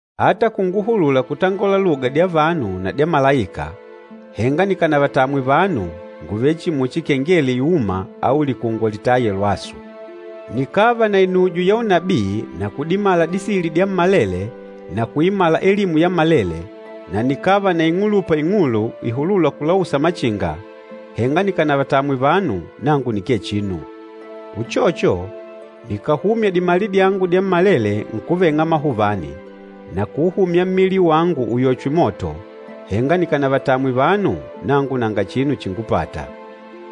Ata kunguhulula kutangola luga dya vanu na dya malaika, henga nikànavatamwe vanu, ngùvele chihi muchi kengele iûma au likungwa litâya lwasu. Nikàva na inujo ya unabii na kudimala disili dyammalele na kuimala elimu yammalele, na nikàva na ing'ulupa ing'ulu ihulûla kulausa machinga, henga nikànavatamwe vanu, nangu nikee chinu. Uchocho, nikàhumya dimali dyangu dyammalele nkuveng'a amahuvani, na kuuhumya mmili wangu uyochwe moto, henga nikànavatamwe vanu, nangu nanga chinu chíngupàtà.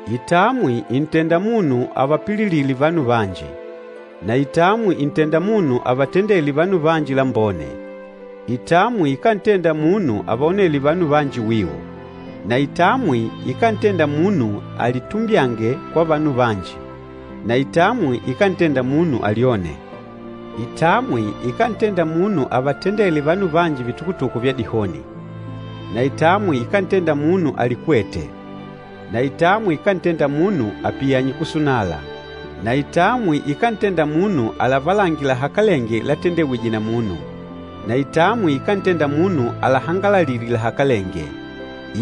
Kutamwa kùntenda munu avapililile vanu vanji, na kutamwa kùntenda munu avatendele vanu vanji lambone. Kutamwa kukántenda munu avaonele vanu vanji wiu, na kutamwa kukántenda munu alitumbyange kwa vanu vanji na kutamwa kukántenda munu alyone. Kutamwa kukántenda munu avatendele vanu vanji vitukutuku vya dihoni na kutamwa kukántenda munu alikwete na kutamwa kukántenda munu apiyanye kusunala na kutamwa kukántenda munu alavalange lahakalenge latendewije na munu, na kutamwa kukántenda munu ahangalalile lahakalenge,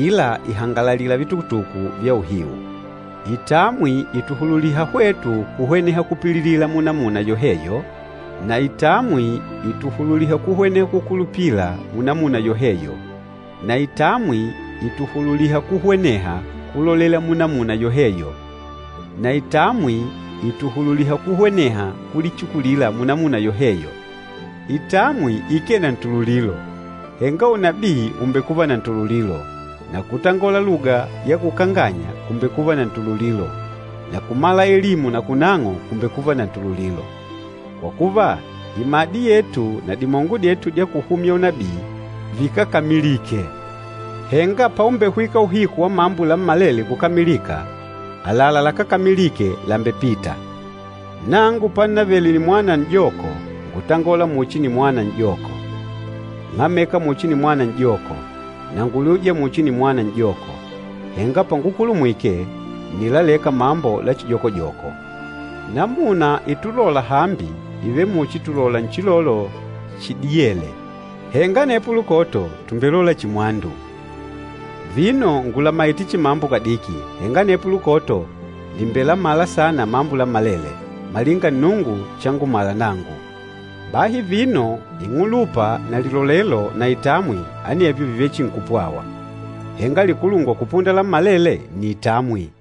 ila kùhangalalila vitukutuku vya uhiu. Kutamwa kutuhululiha hwetu kuhweneha kupililila munamuna yoheyo, na kutamwa kutuhululiha kuhweneha kukulupila munamuna yoheyo, na kutamwa kutuhululiha kuhweneha kulolela munamuna yoheyo, na kutamwa kutuhululiha kuhweneha kulichikulila munamuna yoheyo. Kuvatamwa vanu vanji kukee na ntululilo. Henga unabii ùmbekuva na ntululilo, na kutangola luga ya kukanganya kùmbekuva na ntululilo, na kumala elimu na kunang'o kùmbekuva na ntululilo. Kwa kuva, imadi yetu na dimongo dyetu dya kuhumya unabii, vikákamilike. Henga paumbehwika uhiku wa mambo lammalele kukamilika, àlalá lakákamilike làmbepita. Nangu pannavele nimwana n'joko ngútangola muchi nimwana n'joko, ng'ámeka muchi nimwana n'joko, na ngúliuja muchi nimwana n'joko. Henga pangukulumwike, ǹnilaleka mambo la chijokojoko. Namuna ítulòlà hambi, ìvele muchi tùlola nchilolo chidiyêle, henga anepo paîda, tùmbelola chihi mwandu. Vino ngùlamaite chihi mambo kadiki, henga anepo paîda, nìmbelamala saana mambo lammalele, malinga Nnungu changumala nangu. Bahi vino, ing'ulupa na lilolelo na itamwi, anevyo vìvele chihi nkupwawa, henga likulungwa kupunda lammalele nni itamwi.